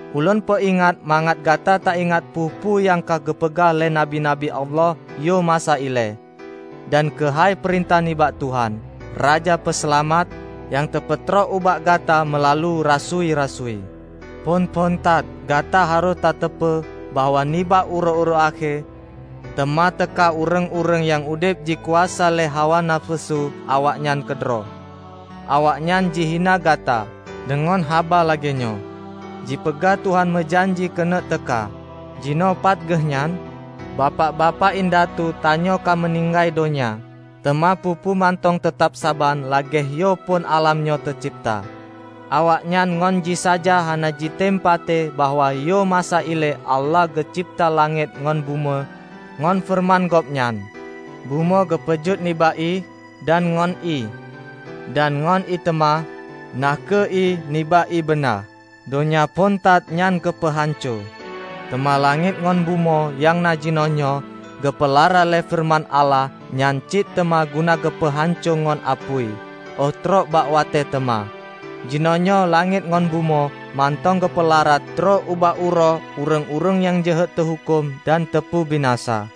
Ulôn peuingat mangat gata taingat peue-peue nyang ka geupeugah lé nabi-nabi Allah yoh masa ilée, dan keuhai peurintah nibak Tuhan, Raja Peuseulamat, nyang teupeutrok ubak gata meulalu rasui-rasui. Phon-phon that, gata harôh tateupeue bahwa nibak uroe-uroe akhé, teuma teuka ureuëng-ureuëng nyang udeb jih jikuasa lé hawa nafeusu awaknyan keudroe. Awaknyan jihina gata deungon haba lagée nyoe, "Jipeugah Tuhan meujanji keuneuk teuka! Jinoe pat Geuhnyan? Bapak-bapak indatu tanyoe ka meuninggai donya, teuma peue-peue mantong teutab saban lagée yoh phon álam nyoe teucebta!" Awaknyan ngon jisaja hana jitem patéh bahwa yoh masa ilée Allah geucebta langét ngon bumoe ngon feureuman Gobnyan. Bumoe geupeujeuet nibak ié, dan ngon ié; dan ngon ié teuma -- na kheueh ié nibak ié beuna -- donya phon that nyan geupeuhanco. Teuma langét ngon bumoe nyang na jinoenyoe, geupeulara lé feureuman Allah nyan cit teuma guna keugeupeuhanco ngon apui óh trok bak watée teuma. Jinoenyoe langét ngon bumoe mantong geupeulara trok ubak uroe ureuëng-ureuëng nyang jeuhet teuhuköm dan teupeubinasa.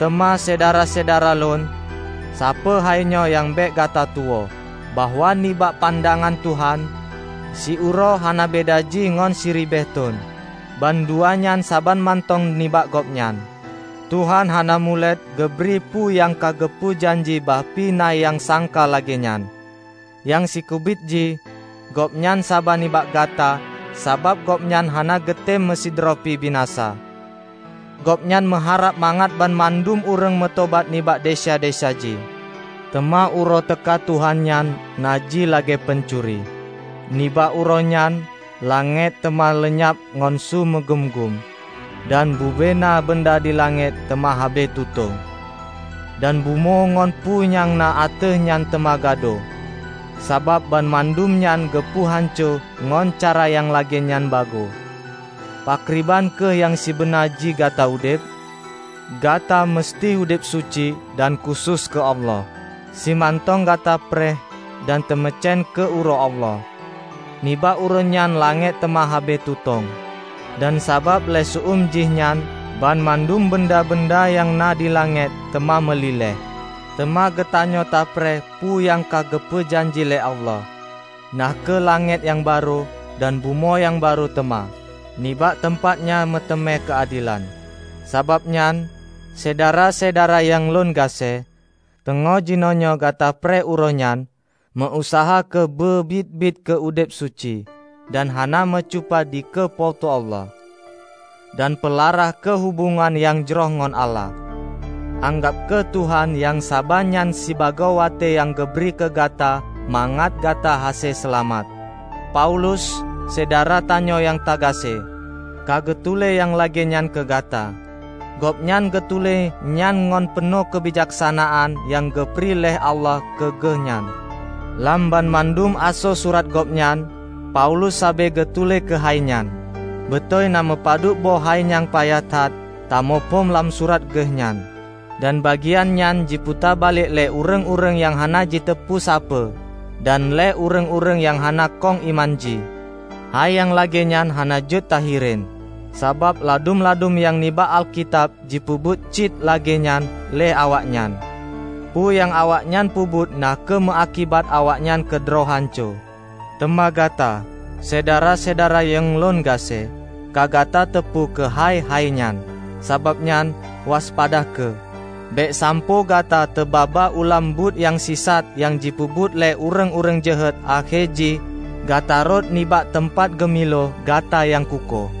Teuma syedara-syedara lôn, sapeue hainyoe nyang bék gata tuwoe; bahwa nibak pandangan Tuhan, siuroe hana beda jih ngon siribée thon -- bandua nyan saban mantong nibak Gobnyan. Tuhan hana mulet geubri peue nyang ka geupeu janji bah pih na nyang sangka lagée nyan. Nyang sikeubiet jih, Gobnyan saba nibak gata, sabab Gobnyan hana geutem meusidroe pih binasa. Gobnyan meuharab mangat banmandum ureuëng meutobat nibak desya-desya jih. Teuma Uroe teuka Tuhan nyan na jih lagée pancuri. Nibak Uroe nyan, langét teuma leunyab ngon su meugum-gum, dan bubena beunda dilangét teuma habéh tutong, dan bumoe ngon peue nyang na ateueh nyan teuma gadôh. Sabab banmandum nyan geupeu hanco ngon cara nyang lagée nyan bagoe, pakriban kheueh nyang sibeuna jih gata udeb? Gata meuseuti udeb suci dan khusos keu Allah, simantong gata preh dan tameucen keu Uroe Allah. Nibak Uroe nyan langét teuma habéh tutong, dan sabab lé seu-eum jih nyan, banmandum beunda-beunda nyang na di langét teuma meuliléh. Teuma geutanyoe tapreh peue nyang ka geupeu janji lé Allah, na kheueh langét nyang barô dan bumoe nyang barô teuma, nibak teumpat nyan meuteumé keuadelan. Sabab nyan, Syedara-syedara nyang lôn gaséh, teungoh jinoenyoe gata preh Uroe nyan, meu-useuha kheueh beubiet-biet keu udeb suci dan hana meucupa dikeue Po teu Allah. Dan peulara kheueh hubongan nyang jroh ngon Allah. Anggab kheueh Tuhan nyang saba nyan sibagoe watée nyang geubri keugata mangat gata hase seulamat. Paulus, syedara tanyoe nyang tagaséh, ka geutuléh nyang lagée nyan keu gata. Gobnyan geutuléh nyan ngon peunoh keubijaksanaan nyang geubri lé Allah keu geuh nyan. Lam banmandum asoe surat gobnyan, Paulus sabe geutuléh keuhai nyan. Beutôi na meupadub boh hai nyang payah that tamuphom lam surat geuh nyan. Dan bagian nyan jiputa balek lé ureuëng-ureuëng nyang hana jiteupeue sapeue dan lé ureuëng-ureuëng nyang hana kong iman jih. Hai nyang lagée nyan hana jeuet tahireuen, sabab ladum-ladum nyang na nibak Alkitab jipeubuet cit lagée nyan lé awaknyan. Peue nyang awaknyan peubuet na kheueh meuakibat awaknyan keudroe hanco. Teuma gata, Syedara-syedara nyang lôn gaséh, ka gata teupeue keuhai hainyan. Sabab nyan, waspada kheueh, bék sampoe gata teuba-ba u lam buet nyang sisat nyang jipeubuet lé ureuëng-ureuëng jeuhet akhé jih gata rhot nibak teumpat geumilo gata nyang kukoh.